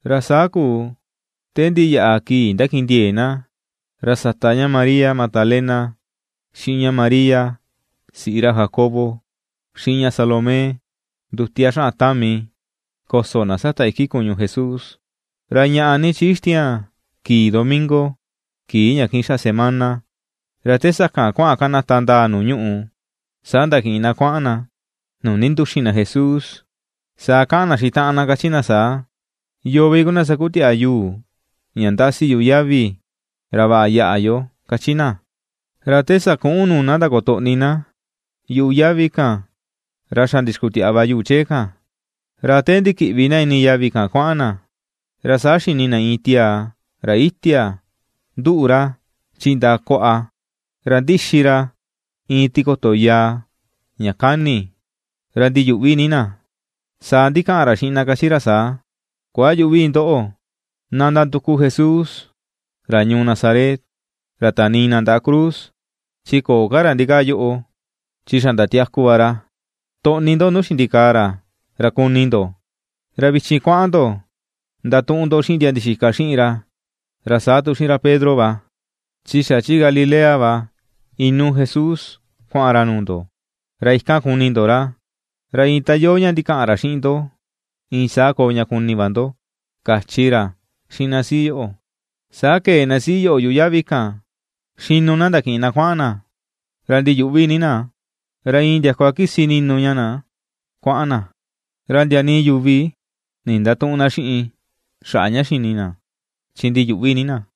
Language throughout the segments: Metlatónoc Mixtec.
Ra saa kuu te ndiyaꞌa kii ndakindiee na, ra sata ña María Magdalena, xiꞌin ña María siꞌi ra Jacobo, xiꞌin ña Salomé, ndutia xaꞌan tami koso na sata iki kuñu Jesús. Ra ñaꞌa ni chi ixtiaan kii domingo, kii ña kiꞌin xaꞌa semana, ra te sakan kuaꞌan kanata ndaa nuu ñuꞌù, saa ndakiꞌin na kuaꞌan na nuu ndinduxin na Jesús. Saa kaꞌan na xiꞌin taꞌan na kachi na saa: ―¿Yoo vi kuu na sakutiaꞌa yuu ña ndasi yuꞌu yavi ra vaꞌa yaꞌa yo? ―kachi na. Ra te sakuꞌun nuu na ndakotoꞌni na yuꞌu yavi kan, ra xa ndixkutiaꞌa va yuu chee kan. Ra te ndikiꞌvi na ini yavi kuaꞌan na, ra saa xini na iin tiaa ra itia, nduꞌu ra chi ndaꞌa kuaꞌa, ra ndixi ra iin tikoto yàà ña kani, ra ndiyuꞌvi ni na. Saa ndikaꞌan ra xiꞌin na kachi ra saa: ―Kuayüꞌvi ndoꞌo, na ndanduku Jesús ra ñuu Nazaret, ra tanii na ndaꞌa cruz, chi köo ka ra ndikaa yoꞌo, chi xa ndatiaku va ra. Toꞌni ndo nuu xindikaa ra ra kuni ndo. Ra vichin kuaꞌan ndo ra ndatuꞌun ndo xiꞌin ndia ndixika xiꞌin ra, ra saa tu xiꞌin ra Pedro va, chi xa chi Galilea va inuu Jesús kuaꞌan ra nuu ndo, ra ikan kuni ndo ra, ra iin ta iyoo ña ndikaꞌan ra xiꞌin ndo iin saa koo ña kuni va ndo ―kachi ra xiꞌin na siꞌi yoꞌo. Saa kee na siꞌi yoꞌo yuꞌu yavi kan xinu na ndakiꞌin na kuaꞌan na. Ra ndiyuꞌvi ni na, ra iin ndiakua kisi ni̱nù ña na kuaꞌan na. Ra ndia nii yuvi ndindatüꞌun na xiꞌin xaꞌa ña xini na, chi ndiyuꞌvi ni na.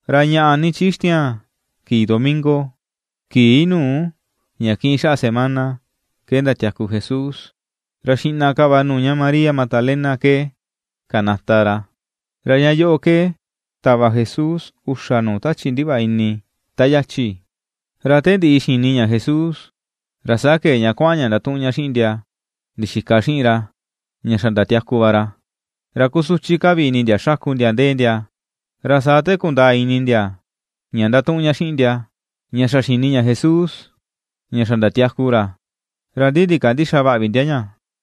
Ra ñaꞌa ni ixtiaan kii domingo, kii nuu ña kiꞌin xaꞌa semana, ke ndatiaku Jesús. Ra xiꞌna ka va nuu ña María Magdalena ke kanata ra. Ra ña yoꞌo ke tava Jesús uxa nuu tachi ndivaꞌa ini ta yachi. Ra te ndiꞌi xini ña Jesús, ra saa kee ña kuaꞌan ña ndatuꞌun ña xiꞌin ndia ndixika xiꞌin ra, ña xa ndatiaku va ra. Ra kusuchi ka vi ini ndia xaku ndia ndee ndia. Ra saa te kundaa ini ndia ña ndatuꞌun ña xiꞌin ndia ña xa xini ña Jesús, ña xa ndatiaku ra, ra ndi ndikandïxa vaꞌa vi ndia ña.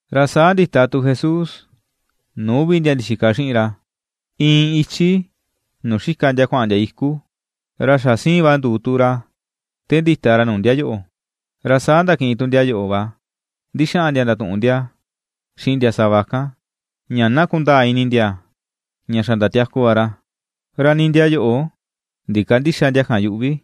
Ra saa ndita tu Jesús nuu uvi ndia ndixika xiꞌin ra, iin ichi nuu xika ndia kuaꞌan ndia iku, ra xa siin va nduu tu ra te ndita ra nuu ndia yoꞌo. Ra saa ndakiꞌin tu ndia yoꞌo va ndixaꞌan ndia ndatuꞌun ndia xiꞌin ndia sava kan, ña na kundaa ini ndia ña xa ndatiaku va ra; ra nii ndia yoꞌo ndikandïxa ndia kan yuꞌu vi.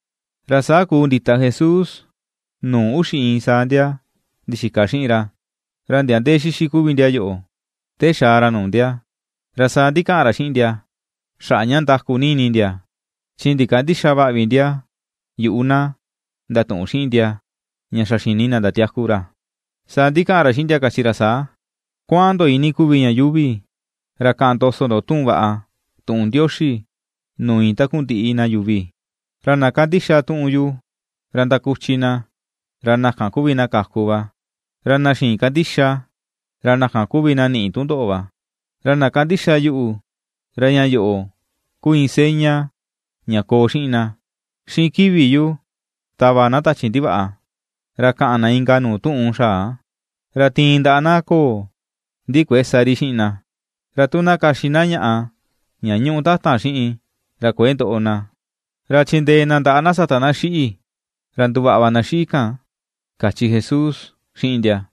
Ra saa kuu ndita Jesús nuu uxi iin saa ndia ndixika xiꞌin ra, ra ndia ndee xixi kuvi ndia yoꞌo te xaa ra nuu ndia. Ra saa ndikaꞌan ra xiꞌin ndia xaꞌa ña ndaku ni ini ndia, chi ndikandïxa vaꞌa vi ndia yuꞌu na, ndatuꞌun xiꞌin ndia ña xa xini na ndatiaku ra. Saa ndikaꞌan ra xiꞌin ndia kachi ra saa: ―Kuaꞌan ndo iinii kuvi ña yuuvi ra kaꞌan ndoso ndo tuꞌun vaꞌa, tuꞌun Ndioxi nuu iin takundiꞌi na yuvi. Ra na kandixa tuꞌun yu, ra kuchi na; ra na kan kuvi na kaku va; ra na xïin kandixa, ra na kan kuvi na ni̱ꞌi̱ tundoꞌo va. Ra na kandixa yuꞌu, ra ña yoꞌo ku iin seña ña koo xiꞌin na: Xiꞌin kivi yu tava na tachi ndivaꞌa, ra kaꞌan na inka nuu tuꞌun xaa; Ra tiin ndaꞌa na ko̱o̱, ndi kuëe sa ri xiꞌin na, ra tu na kaxi na ñaꞌa ña ñuꞌu tatan xiꞌin, ra kuëe ndoꞌo na; ra chindee na ndaꞌa na sata na xiꞌi̱, ra nduvaꞌa va na xiꞌi̱ kan ―kachi Jesús xiꞌin ndia.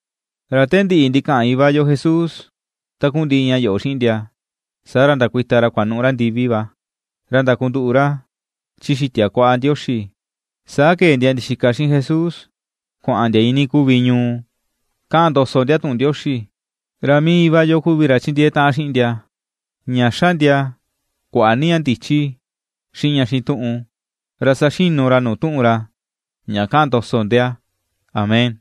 Ra te ndiꞌi ndikaꞌan Iva yo Jesús takundiꞌi ña yoꞌo xiꞌin ndia, saa ra ndakuita ra kuanuꞌu ra ndivi va, ra ndakunduꞌu ra chi xitia kuaꞌa Ndioxi. Saa kee ndia ndixika xiꞌin Jesús kuaꞌan ndia iinii kuvi ñuu kaꞌan ndoso ndia tuꞌun Ndioxi, ra mii Iva yo kuvi ra chindiee taꞌan xiꞌin ndia, ña xa ndia kuaꞌa ni ña ndichi, xiꞌin ña xituꞌun ra saxinu ra nuu tuꞌun ra, ña kaꞌan ndoso ndia. Amén.